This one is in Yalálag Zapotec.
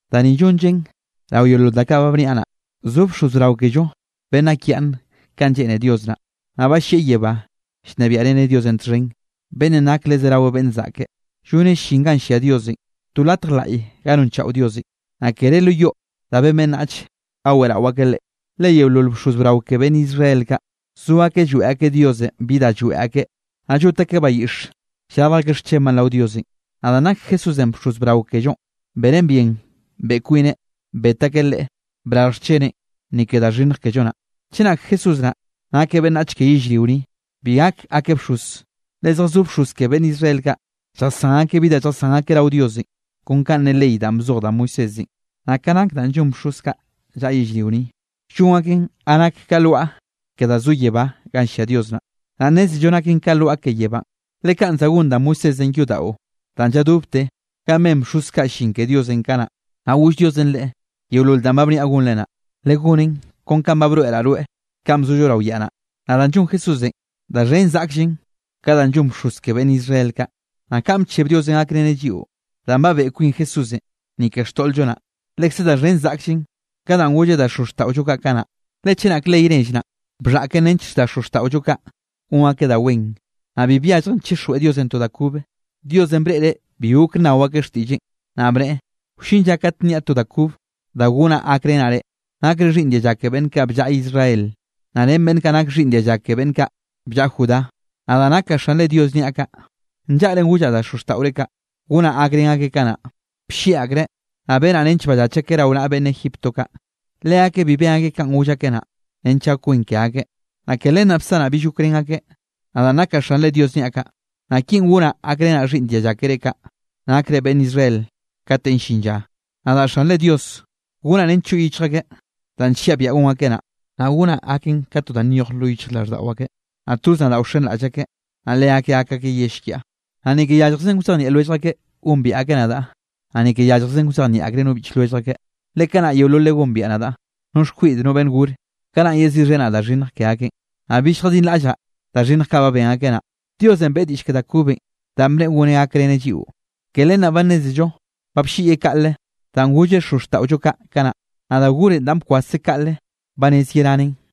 Da ni llonllen rao yeolol da kaꞌ ba bniaꞌ naꞌ: zo bxoz brao kello beꞌnn nakyaꞌnne kanꞌ lleꞌne Dios naꞌ, naꞌ ba llieꞌ yebánꞌ llnebiaꞌreneꞌ Diosenꞌ txhen, beꞌnnenꞌ nakeꞌ le zerawe beꞌnn zaꞌke. Lloneꞌ llin ganꞌ llia Diosenꞌ, to latj laꞌye ga nonchaꞌo Diosenꞌ, naꞌ kere lo yoꞌ da ben beꞌnnach ga weꞌrao akeꞌ Leꞌe. Le yeolol bxoz brao ke beꞌnn Israel kaꞌ, zo akeꞌ lloeꞌ akeꞌ Diosenꞌ bi da lloeꞌ akeꞌ, naꞌ llot akeꞌ bayiꞌx llrarj akeꞌ xchenbaꞌ rao Diosenꞌ. Naꞌ danꞌ nak Jesúsenꞌ bxoz brao kellonꞌ, benen bien beꞌe kwineꞌ, bet akeꞌ Leꞌe brarj xcheneꞌn, ni ke da xhinnj kello naꞌ. Chenak Jesúsenꞌ nna nakeꞌ beꞌnnach ke yellrio ni, bi gak gakeꞌ bxoz, le zjazó bxoz ke beꞌnn Israel kaꞌ, lljasán akeꞌ bi da lljasán akeꞌ rao Diosenꞌ, kon kanꞌ ne ley danꞌ bzoj da Moisésenꞌ. Naꞌ ka nak danꞌ llon bxoz kaꞌ llaꞌa yellrio ni, llon akeꞌn ganꞌ nak ka lwaꞌa ke danꞌ zo yebá ganꞌ llia Dios naꞌ. Naꞌ nnézello naken ka lwaꞌa ke yebánꞌ, le kanꞌ za gon da Moisésenꞌ yodaꞌo danꞌ lladobte ganꞌ ben bxoz kaꞌ llin ke Diosenꞌ kanaꞌ, naꞌ goll Diosenꞌ leꞌe: “Yeolol danꞌ ba bniaꞌ gonre naꞌ, legonen kon kanꞌ ba broeꞌraꞌ rweꞌ kanꞌ bzollo rao yaꞌ naꞌ.” Naꞌ da llon Jesúsenꞌ, da xhen zaꞌkllen ka danꞌ llon bxoz ke beꞌnn Israel kaꞌ. Naꞌ kanꞌ bcheb Diosenꞌ gakreneꞌ lliꞌo danꞌ ba beꞌe kwin Jesúsenꞌ, ni ke xtoꞌl-llo naꞌ, lekze da xhen zaꞌkllen ka danꞌ golleꞌ da xozxtaꞌollo kaꞌ kanaꞌ. Le chenak ley nell naꞌ, bxhaꞌken nench da xozxtaꞌollo kaꞌ gon akeꞌ da wen, naꞌ bi byalljen chixjweꞌ Diosenꞌ to da kobe. Diosenꞌ breꞌreꞌ bi gok nnao akeꞌ xtiꞌlleꞌn, naꞌ bneꞌe: Wllin lla kate nniaꞌ to da kob da gonaꞌ gakrenaꞌ reꞌ, nakre xhiꞌnn dialla ke beꞌnn kaꞌ bllaꞌa Israel, naꞌ ren beꞌnn kaꞌ nak xhiꞌnn dialla ke beꞌnn kaꞌ bllaꞌa Judá. Nadaꞌ nakaꞌ Xanre Diosenꞌ niaꞌ kaꞌ. Nllaꞌren gollaꞌ da xozxtaꞌore kaꞌ, gonaꞌ gakrén akeꞌ kanaꞌ, bllieꞌ akreꞌ, naꞌ benaꞌ nench ballach akeꞌ rao naꞌa beꞌnn Egipto kaꞌ. Leakeꞌ bi ben akeꞌ kanꞌ goll akeꞌ naꞌ, nench gak wen ke akeꞌ. Naꞌ ke len naꞌ bsanaꞌ bill gokrén akeꞌ, nadaꞌn nakaꞌ Xanre Diosenꞌ niaꞌ kaꞌ. Naꞌ kinꞌ gonaꞌ gakrenaꞌ xhiꞌnn dialla kere kaꞌ, nakre beꞌnn Israel katenꞌ llin lla: Nadaꞌ Xanre Dios gonaꞌ nench choꞌ yichj akeꞌ danꞌ nlliaꞌ biaꞌa gon akeꞌ naꞌ. Naꞌ gonaꞌ gaken ka to da nyoj lo yichjraꞌlldaꞌo akeꞌ, naꞌ toz nadaꞌ wxenraꞌll akeꞌ, naꞌ leakeꞌ gak akeꞌ yell kiaꞌ. Naꞌ ni ke yalljzen wzejnieꞌ lwellj akeꞌ gombiaꞌ akeꞌ nadaꞌ, naꞌ ni ke yalljzen wzejnieꞌ akreꞌ no biꞌch lwellj akeꞌ, le kanaꞌ yeololeꞌ gombiaꞌ nadaꞌ, no xkwiꞌd no beꞌnn gore. Kanaꞌn yeziꞌxhenaꞌ da xhinnj ke akeꞌn, naꞌ bill lljadinraꞌllaꞌ da xhinnj kaꞌ ba ben akeꞌ naꞌ. Diosenꞌ beꞌe diꞌll ke da kobenꞌ danꞌ bneꞌe goneꞌ gakreneꞌ lliꞌo, ke len naꞌ ba nnézello ba blliꞌyeꞌ kaꞌle danꞌ golleꞌ xozxtaꞌollo kaꞌ kanaꞌ. Naꞌ da gorenꞌ danꞌ ba bkwaseꞌ kaꞌle ba rez yeranen.